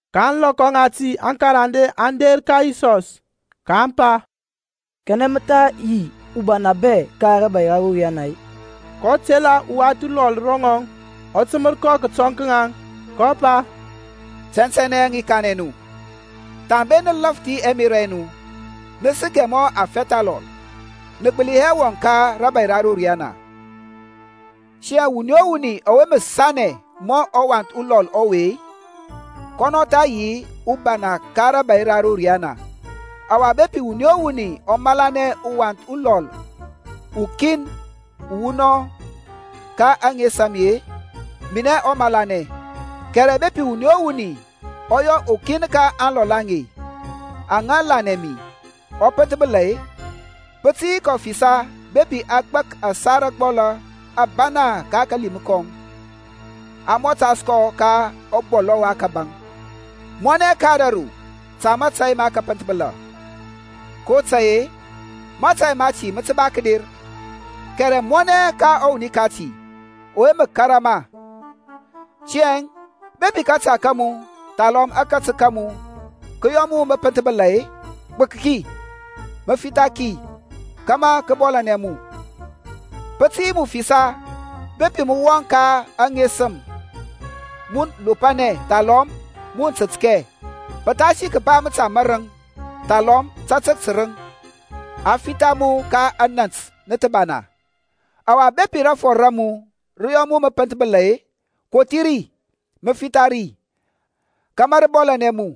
Ka ȧŋlɔkɔ ŋati aŋkarande aŋ der ka Yisɔs, ka aŋ pa, Kanɛ mǝ tha yi ubana bɛ ka rȧbȧy ra ro riana-e? kɔ tela uwath ulɔl ro ŋɔŋ, ɔ tǝmǝr kɔ kǝtɔŋ ka ŋaŋ, kɔ pa, Tɛntɛnɛ i kanɛ nu, Thambe nǝ lȧfthi ɛmerȧ ɛ nu-e, nǝ sǝkɛ mɔ afɛth alɔl-e, nǝ gbǝli hɛ wɔŋ ka rȧbȧy ra ro riyana. Tiyȧŋ wuni o wuni ɔwe mǝ sanɛ mɔ ɔwath ulɔl ɔwe-e, kɔnɔ tha yi ubana ka rȧbȧy ra ro riyana. Ɔwa bepi wuni o wuni ɔ malanɛ uwath ulɔl ukin uwunɔŋ ka ȧŋes a mi-e, minɛ ɔ malanɛ. Kɛrɛ bepi wuni o wuni ɔ yɔ ukin ka aŋlɔl aŋe aŋa lanɛ mi ɔ pǝnthbǝla-e, pǝ tǝ yi kɔ fisa bepi a gbak kɔ ȧsar ȧgbɔlȧ ȧbana ka kalim kɔŋ, a mɔtas kɔ ka ɔbɔlɔŋ wa kȧbȧŋ. Mɔnɛ ka ȧdȧru ta mətȧy mǝpǝnthbǝla, kotȧy-e mȧtȧy mati mǝ ba kǝder; kɛrɛ mɔnɛ ka ɔwuni kati ɔwe mǝ kȧrȧ ma! Tiyȧŋ bepi kȧta ka mu thalɔm akatǝk ka mu kǝ yɔ mu mǝ pǝnthbǝla-e, gbǝk ki, mǝ fitha ki kȧmȧ kǝ bɔlȧnɛ mu. Pǝ tǝ yi mu fisa bepi mǝ wɔŋ ka aŋesǝm mun lopȧnɛ thalɔm mun tǝtkɛ pǝthasi kǝba mǝta mȧrǝŋ thalɔm tatǝk tǝrǝŋ, ɔwa a fitha mu ka anant nǝthǝbana. Ɔwa bepi rȧfɔr ra mu rǝ yɔ mu mǝ pǝnthbǝla-e, kothi ri, mǝ fitha ri kȧmȧ rǝ bɔlȧnɛ mu.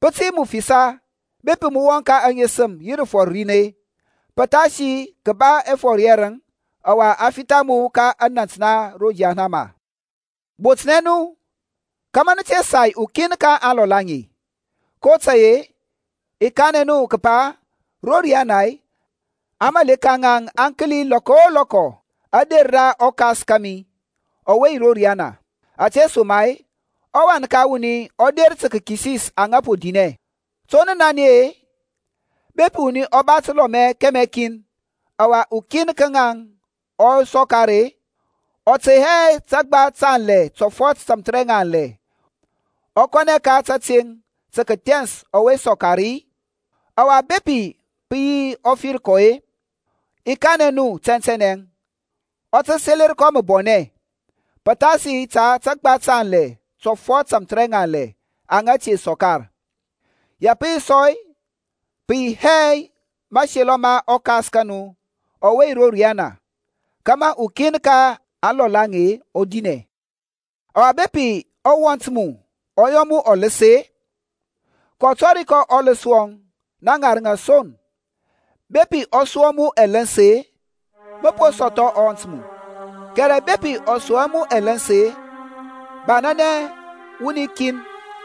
Pǝ tǝ yi mu fisa bepi mǝ wɔŋ ka aŋesǝm yi rǝfɔr rin-e, pǝthasi kǝba ɛfɔr yɛrǝŋ ɔwa a fitha mu ka anant na ro yahanama. Botnɛ nu kȧmȧ nǝ te sai ukin ka aŋlɔl aŋe, kotȧy-e, i kanɛ nu kǝpa ro riyana aŋmȧleka ŋaŋ aŋ kǝli lɔkɔ o lɔkɔ ȧder ra ɔKas kȧmi ɔwe yi ro riyana. Ȧtesoma-e ɔWan ka wuni ɔ der tǝ kǝkisis aŋa po dinɛ. To nǝ nanɛ-e? Bepi wuni ɔ ba tǝlɔmɛ kɛmɛ kin, ɔwa ukin ka ŋaŋ ɔ sɔkar-e, ɔ tey hɛ antǝgba tanlɛ tɔfɔt tamthǝrɛŋanlɛ, ɔ kɔnɛ ka tȧteŋ tǝ kǝthɛns ɔwe sɔkar-i? Ɔwa bepi pǝ yi ɔ fir kɔ-e, i kanɛ nu tɛntɛnɛ ɔ tǝ selǝr kɔ mǝbɔnɛ pǝthasi ta antǝgba tanlɛ tɔfɔt tamthǝrɛŋanlɛ aŋa te sɔkar. Ya pǝ yi sɔ-e, pǝ yi hɛ mȧselɔ ma ɔKas ka nu ɔwe yi ro riyana kȧmȧ ukin ka aŋlɔl aŋe ɔ dinɛ. Ɔwa bepi ɔwɔnt mu ɔ yɔ mu ɔlǝs-e, kɔ tɔri kɔ ɔlǝs wɔŋ na ŋarǝŋ son; bepi ɔ sua mu ɛlǝns-e, mǝ po sɔthɔ ɔwɔnt mu, kɛrɛ bepi ɔ sua hɛ mu ɛlǝns-e, banȧnɛ wuni kin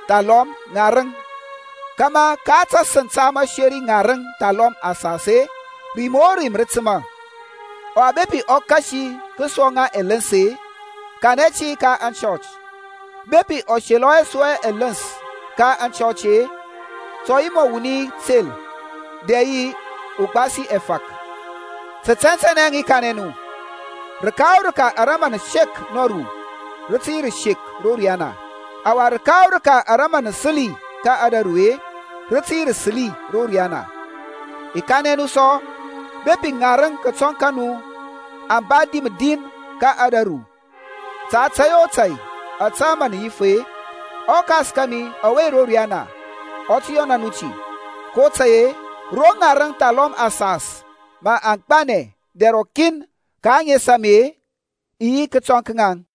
thalɔm ŋarǝŋ kȧmȧ ka tasǝŋ ta mǝseri ŋarǝŋ thalɔm asas-e, rim o rim rǝ tǝma. Ɔwa bepi ɔ kasi kǝsuwa ŋa ɛlǝns-e, kanɛ ti ka aŋchɔch. Bepi ɔ selɔ hɛ sua ɛlǝns ka aŋchɔch-e, ta ɔ yi ro mu mɔ wuni tel dɛ yi ugbasi ɛfȧk. Tǝ tɛntɛnɛ i kanɛ nu, rǝka o rǝka ara mǝ nǝ sek nɔru rǝ tǝ yi rǝsek ro riyana, ɔwa rǝka o rǝka ara mǝ nǝ sǝli ka ȧdȧru-e rǝ tǝ yi rǝsǝli ro riyana. I kanɛ nu sɔ, bepi ŋarǝŋ kǝtɔŋ ka nu aŋ ba dim din ka ȧdȧru ta tȧy o tȧy ȧtȧ mǝ nǝ yif-e, ɔKas kȧmi ɔwe yi ro riyana ɔ tǝ yɔna nu ti. kotȧy-e, ro ŋarǝŋ thalɔm asas-e mǝ aŋ gbanɛ dɛr rɔkin ka ȧŋes a mi-e, rǝ i yi kǝtɔŋ ka ŋaŋ.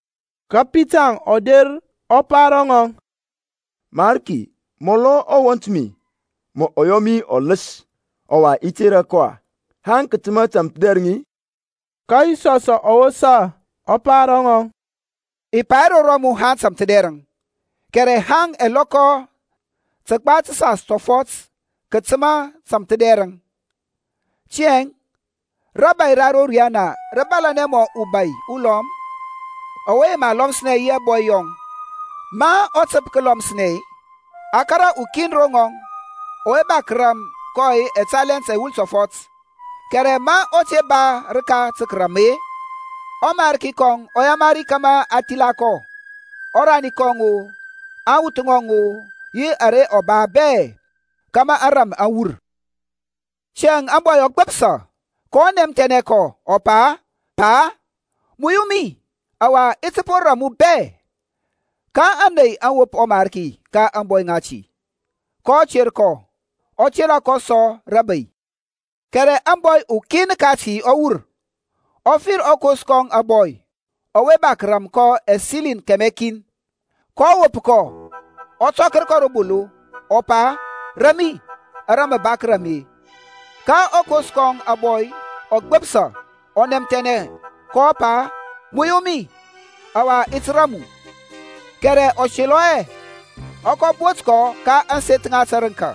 Ka Pitarȧŋ ɔ der ɔ pa ro ŋɔŋ, Mariki, amɔlɔ ɔwɔnt mi mǝ ɔ yɔ mi ɔlǝs, ɔwa i tera kɔ-a? Haŋ kǝtǝma tamthǝdɛrǝŋ-a? Ka Yisɔsȧŋ ɔ wosa ɔ pa ro ŋɔŋ, I pa hɛ ro mu haŋ tamthǝdɛrǝŋ, kɛrɛ haŋ ɛlɔkɔ tǝgba tǝsas tɔfɔt kǝtǝma tamthǝdɛrǝŋ. Tiyȧŋ rȧbȧy ra ro riyana rǝ bȧlȧnɛ mɔ ubȧy ulɔm ɔwe yema lɔmǝsnɛ yi ɛbɔy yɔŋ. Ma ɔ tǝp kǝlɔmǝs-e, a kȧrȧ ukin ro ŋɔŋ ɔwe ba kǝram kɔ ɛtalent ɛwul tɔfɔt. Kɛrɛ ma ɔ te ba rǝka tǝ kǝrȧm-e, ɔmarki kɔŋ ɔ yamari kȧmȧ a thila kɔ, ɔrani kɔŋ-o, aŋwuth ŋɔŋ-o yi ara ɔ ba bɛ kȧmȧ ȧŋrȧm aŋ wur. Tiyȧŋ ȧŋbɔy ɔ gbǝpsa, kɔ nɛmthɛnɛ kɔ, ɔ pa, Pa, muyu mi ɔwa i ti po ram mu bɛ. Ka ȧney aŋ wop ɔmarki ka ȧŋbɔy ŋati, kɔ ter kɔ, ɔ tera kɔ sɔ rabei. Kɛrɛ ȧŋbɔy ukin kati ɔ wur, kɔ fir ɔkos kɔŋ ȧbɔy ɔwe ba kǝram kɔ ɛsiliŋ kɛmɛ kin. Kɔ wop kɔ, ɔ tɔker kɔ ro bolo, ɔ pa, Ram mi ara mǝ ba kǝram mi. Ka ɔkos kɔŋ ȧbɔy ɔ gbǝpsa ɔ nɛmthɛnɛ, kɔ pa, Muyu mi, ɔwa i ti ram mu. Kɛrɛ ɔ selɔ hɛ, ɔ kɔ bot kɔ ka ȧŋseth ŋa tǝrǝŋka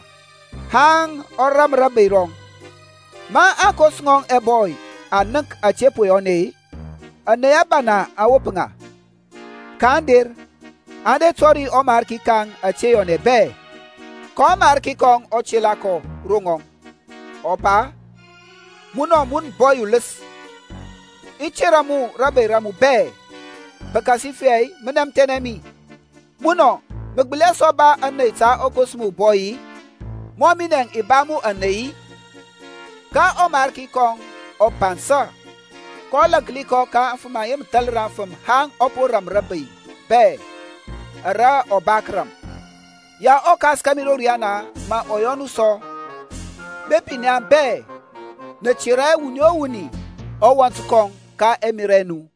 haŋ ɔ ram rabei rɔŋ. Ma aŋkos ŋɔŋ ɛbɔy aŋ nənk ȧte po yɔnɛ-e, ȧney ȧbana aŋ wop ŋa, kaŋ der aŋ der aŋ tɔri ɔmarki ka ŋaŋ ȧte yɔnɛ bɛ. Ka ɔmarki kɔŋ ɔ tela kɔ ro ŋɔŋ, ɔ pa, Munɔ, mun ȧbɔy ulǝs, i tera mu rȧbȧy araŋ bɛ, pǝkasifɛ mɔ nɛmthɛnɛ mi. Munɔ, mǝ gbǝli hɛ sɔ ba ȧney ta ɔkos mu ȧbɔy-i, mɔ minɛȧŋ i ba mu ȧney-i? Ka ɔmarki kɔŋ ɔ bansȧ, kɔ lȧnki kɔ kia aŋa mǝ thalǝr afǝm haŋ ɔ po ram bɛ ara ɔ ba tǝ kǝram. Ya ɔKas kȧmi ro riyana mǝ ɔ yɔ nu sɔ bepi naŋ bɛ nǝ tera hɛ wuni o wuni ɔwɔnt kɔŋ ka ɛmerȧ ɛ nu.